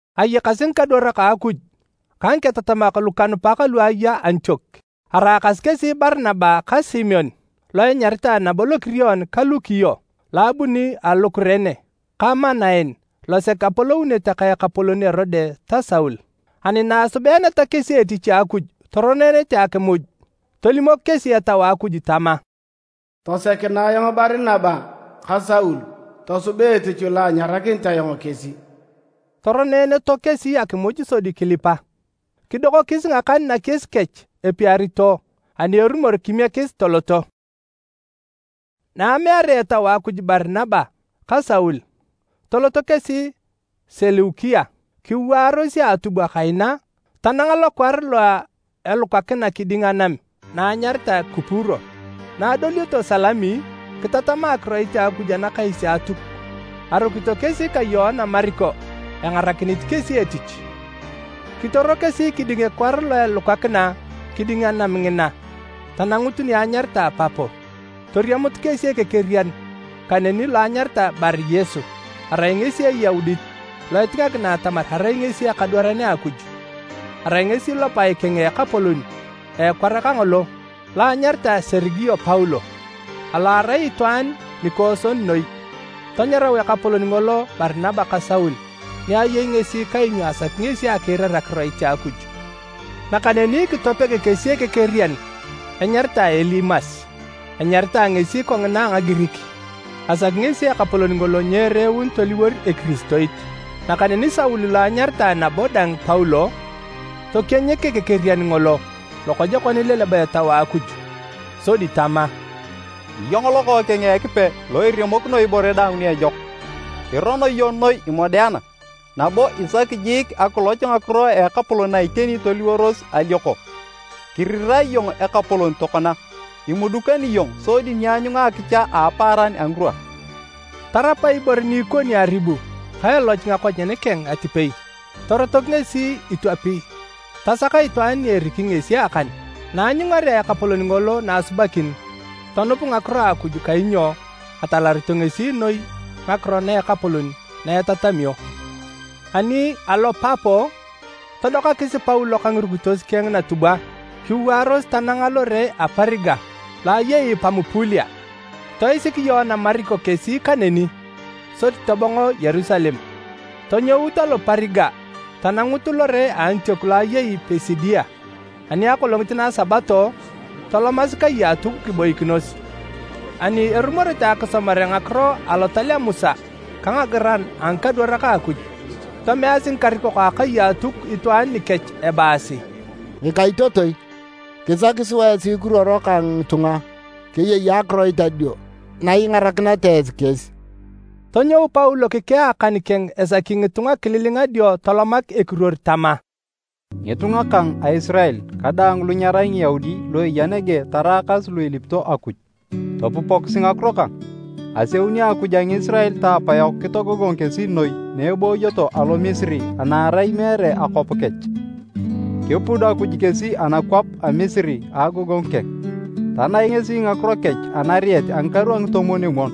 Ayakasi ngikadwarak a Akuj ka ngiketatamak lokanupak lu eya Antiok. Araakasi kesi Barinaba ka Simeon lo enyaritae nabo Lokirion ka Lukio lo abuni alo Kurene ka Manaen losek apolounete ka ekapolon Erode ta Saul. Ani na asubeeneta kesi etich a Akuj toroneenete akimuj, tolimok kesi Etau a Akuj tama, “Tosekinae ayong Barinaba ka Saul tosuba etich lo anyarakinit ayong kesi.” Toroneeneto kesi akimuj sodi kilipa, kidokokis ngakan nakies kech epiarito ani erumor kimiekis toloto. Na amearea Etau a Akuj Barinaba ka Saul, toloto kesi Seleukia. Kiwaaros a atubwa kaina tananga lokwar lo elukakina kiding anam na enyaritae Kupuro. Na adolioto Salami, kitatama akiroit a Akuj anakais a Atuk. Arukito kesi ka Yoana Mariko engarakinit kesi etich. Kitoro kesi kiding ekwar lo elukakina kiding anam ngina tanangut ni anyaritae Papo. Toriamut kesi ekekerian kaneni lo anyaritae Bari-Yesu, arai ngesi Eyaudit lo etingakina atamar arai ngesi ekadwaran a Akuj. Arai ngesi lopae keng a ekapolon a ekwar kangolo lo anyaritae Serigio Paulo, alo arai itwaan nikooson noi. Tanyarau ekapolon ngolo Barinaba ka Saul ni ayei ngesi kainyo asaki ngesi akiirar akiroit a Akuj. Nakaneni kitopeg kesi ekekerian enyaritae Elimas (enyaritae ngesi kongina a Ngagirik,) asaki ngesi ekapolon ngolo nyereeun toliwor Ekiristoit. Nakaneni Saul lo enyaritae nabo dang Paulo, tokienyik ekekerian ngolo lokojokon ileleba Etau a Akuj. Sodi tama, “Iyong lokookeng a Ekipe lo iremokino ibore daang ni ejok! Irono iyong noi imodeana, nabo isaki jiik akiloch ngakiro a Ekapolon na iteni toliworos alioko! Kirirae iyong Ekapolon tokona, imudukani iyong sodi nyianyunga akicha a apaaran a ngirwa.” Tarap ibore ni ikoni aribu ka eloch ngakonyen keng atipei, torotok ngesi itwapi tasak itwaan ni eriki ngesi akan. Na aanyungarea ekapolon ngolo na asubakin, tonup ngakiro a Akuj kainyo atalarito ngesi noi ngakiro na Ekapolon na etatamio. Ani alo Papo, todokasi Paulo ka ngirukitos keng natubwa kiwaaros tananga lore a Periga lo ayei Pamupulia. Toisik Yoana Mariko kesi kaneni sodi tobongo Yerusalem. Tonyout alo Periga tanangut lore a Antiok lo eyei Pisidia, ani akolongit na a Sabato, tolomasi kai a Atuk kiboikinos. Ani erumorete akisomare ngakiro Alotal a Musa ka ngagiran a ngikadwarak a Akuj, tomeasi ngikarikok a akai a Atuk itwaan nikech ebaasi, “Ngikaitotoi, kisaki sua esi kiruoro ka ngitunga keyei akiroit adio na ingarakineta esi kesi.” Tonyou Paulo kikea akan keng esaki ngitunga kililinga dio tolomak ekiruor tama, “Ngitunga kang a Isirael ka daang lu nyerai Ngiyaudi lu eya nege taraakas lu ilipito Akuj, topupokisi ngakiro kang! Aseuni Akuj a Ngisirael ta apayok kitogogong kesi noi na ebooyoto alo Misiri ana arai meere akwap kech. Kipud Akuj kesi anakwap a Misiri a agogongu keng, tanaik ngesi ngakiro kech anariet a ngikaru a ngitomwon-omwon.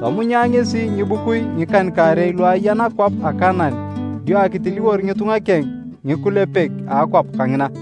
Tomunya ngesi ngibukui ngikan-kaarei lu aya nakwap a Kanaan dio akitiliwor ngitunga keng ngikulepek a akwap kangina.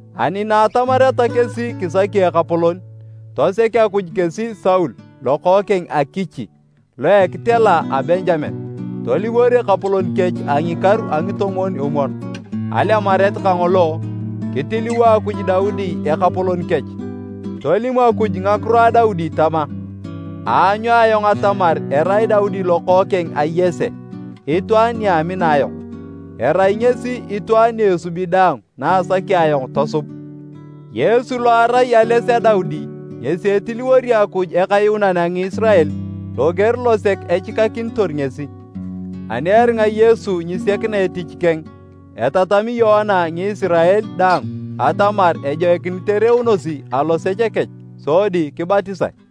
Ani na atamareta kesi kisaki ekapolon, tosek Akuj kesi Saul lokookeng a Kichi lo a ekitela a Benjamen, toliwor ekapolon kech a ngikaru a ngitomwon-omwon. Alemaret kangolo, kitiliwo Akuj Daudi ekapolon kech. Tolim Akuj ngakiro a Daudi tama, ‘Aanyu ayong atamar erai Daudi lokookeng a Yese itwaan ni amina ayong. Erai ngesi itwaan ni esubi daang na asaki ayong tosub.’ Yesu lo arai ales a Daudi ngesi etiliwori Akuj Ekayuunan a Ngisirael loger losek echikakinitor ngesi. Ani eringa Yesu nyisiakina etich keng, etatami Yoana Ngisirael daang atamar ejoikinit ereunosi alosech kech sodi kibatisae.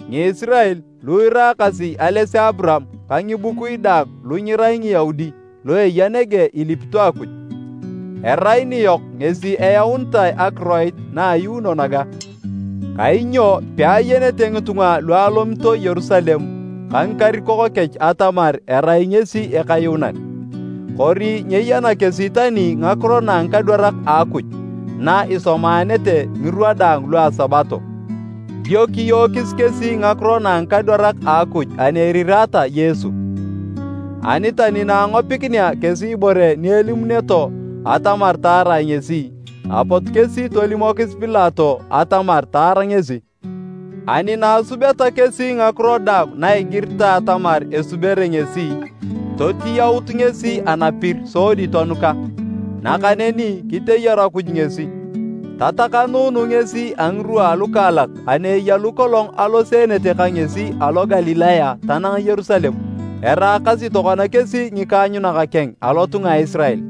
“Ngisirael, lu iraakasi ales a Aburaam ka ngibukui daang lu nyerai Ngiyaudi lu eya nege ilipito Akuj. Erai niyok ngesi eyaunitae akiroit na ayuuno naga! Kainyo peayenete ngitunga lu alomito Yerusalem ka ngikarikok kech atamar erai ngesi Ekayuunan. Kori nyeyana kesi tani ngakiro na a ngikadwarak a Akuj na isomaanete ngirwa daang lua Sabato. Dio kiyookis kesi ngakiro na a ngikadwarak a Akuj ani erirata Yesu. Ani tani na angopikinea kesi ibore ni elimuneto atamar taarae ngesi, apot kesi tolimokis Pilato atamar taar ngesi. Ani na asubeta kesi ngakiro daang na igiritae atamar esubere ngesi, totiyaut ngesi anapir sodi tonuka. Nakaneni kiteyaru Akuj ngesi, tatakanuunu ngesi a ngirwa alukaalak ani eya lu kolong aloseenete ka ngesi alo Galilaya tanang Yerusalem. Eraakasi tokona kesi ngikaanyunak keng alotunga a Isirael.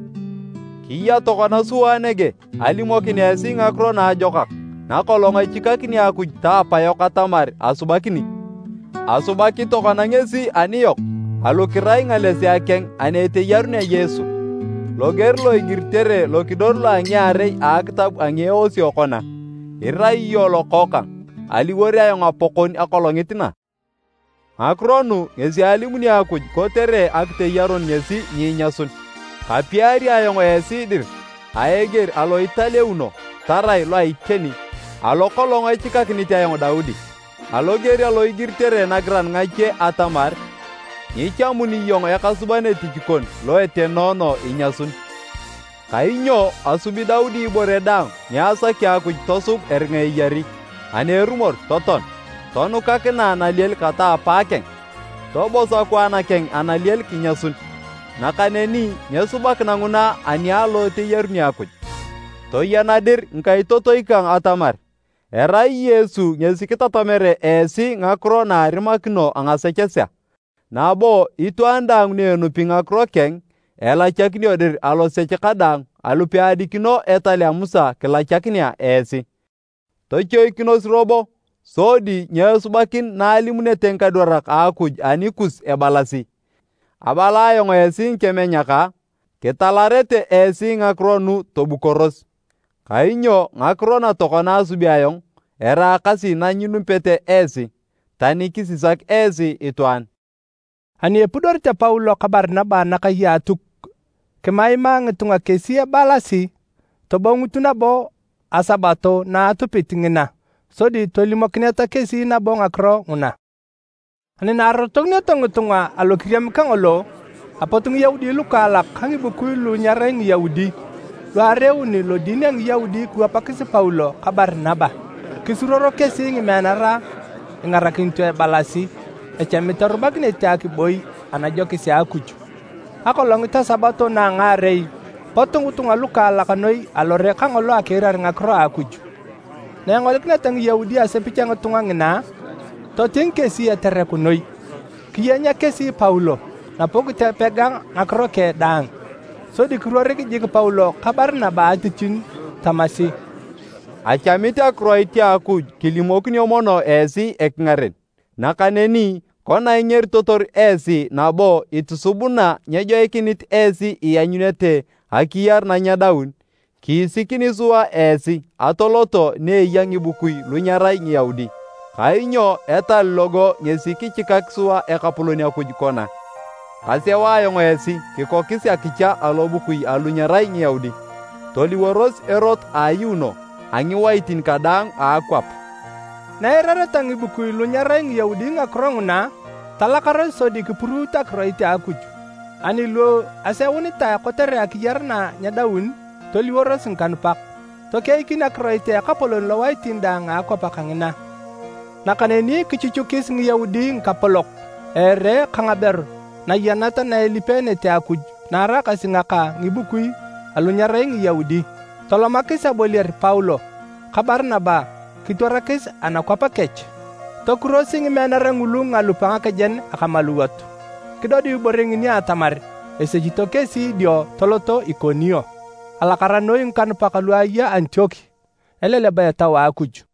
Kiya tokona sua nege alimokin esi Ngakiro Naajokak nakolong echikakini Akuj ta apayok atamar asubakini, asubaki tokona ngesi aniyok alu kirai ngalesea keng ani eteyarunea Yesu. Loger lo igiritere lokidor lo a ngiarei a akitab a ngieosio kona, ‘Irai iyong Lokookang, aliwor ayong Apakon akolongit na.’ Ngakiro nu ngesi alimuni Akuj kotere akiteyarun ngesi nyiinyasun, ‘Kapiari ayong esi dir a eger alo italeuno tarai lo a iteni, alo kolong echikakinit ayong Daudi.’ Aloger alo igiritere nagiran ngache atamar, ‘Nyichamuni iyong ekasuban etich kon lo etenoono inyasun.’ Kainyo asubi Daudi ibore daang ni asaki Akuj tosub eringa eyari. Ani erumor totoan, tonukakinae nalielin kata a apaakeng, tobos akwaan keng analiel kinyasun. Nakaneni nyesubakina nguna ani alo eteyaruni Akuj. Toyena dir ngikaitotoi kang atamar, erai Yesu ngesi kitatamere esi ngakiro na a arimakino ngasechesea. Nabo itwaan daang ni enupi ngakiro keng, elachakinio dir alosech kadaang alu peadikino etal a Musa kilachakinea esi. Tochoikinos robo sodi nyeesubakin na alimunete ngikadwarak a Akuj anikus ebalasi, ‘Abala ayong esi ngikemenyak a! Kitalarete esi ngakiro nu tobukoros! Kainyo ngakiro na tokona asubi ayong eraakasi na nyinupete esi, tani kisisak esi itwaan!’” Ani epudorete Paulo ka Barinaba anakai a Atuk, kimaimaa ngitunga kesi ebalasi tobongut nabo a Sabato na atupit ngina sodi tolimokineta kesi nabo ngakiro nguna. Ani na arotokinioto ngitunga alo kiriam kangolo, apot Ngiyaudi lukaalak ka ngibukui lu nyerai Ngiyaudi, lu areeun lodin a Ngiyaudi kiwapakis Paulo ka Barinaba. Kisuruoro kesi ngimeanara ingarakinito ebalasi echamit erubakinete akiboi anajokis a Akuj. Akolongit a Sabato na a ngaarei, pot ngitunga lukaalak noi alore kangolo akiirar ngakiro a Akuj. Na engolikineta Ngiyaudi asepich a ngitunga ngina, toting kesi etereku noi. Kiyenya kesi Paulo nabo kitopega ngakiro keng daang. Sodi kiruoro jik Paulo ka Barinaba a atitinyu tamasi, “Achamit akiroit a Akuj kilimokinio mono esi ekingaren. Nakaneni kona ingeritotor esi nabo itusubuna nyejoikinit esi ianyunete akiyar na nyedaun, kiisikini sua esi atoloto ni eya ngibukui lu nyerai Ngiyaudi. Kainyo etal logo ngesi kichikak sua Ekapolon Akuj kona, ‘Kaseu ayong esi kikokis akicha alobukui alu nyerai Ngiyaudi, toliworos erot a ayuuno a ngiwaitin kadaang a akwap.’” Na eirareta ngikubui lu nyerai Ngiyaudi ngakiro nguna, talakaros sodi kipuruut akiroit a Akuj. Ani lu aseunitae kotere akiyar na nyedaun, toliworos ngikanupak. Tokeikin akiroit a Ekapolon lowaitin daang a akwap kangina. Nakaneni kichuchukis Ngiyaudi ngikapolok a ere ka ngaberu nayanat na elipeenete Akuj na araakasi ngaka ngibukui alu nyerai Ngiyaudi. Tolomakis aboliar Paulo ka Barinaba kitwarakis anakwap kech. Tokurosi ngimeanara ngulu ngalup a ngakejen akamaluwot, kidodiu ibore ngini atamar esechito kesi dio toloto Ikonio. Alakara noi ngikanupak lu aya Antiok eleleba Etau a Akuj.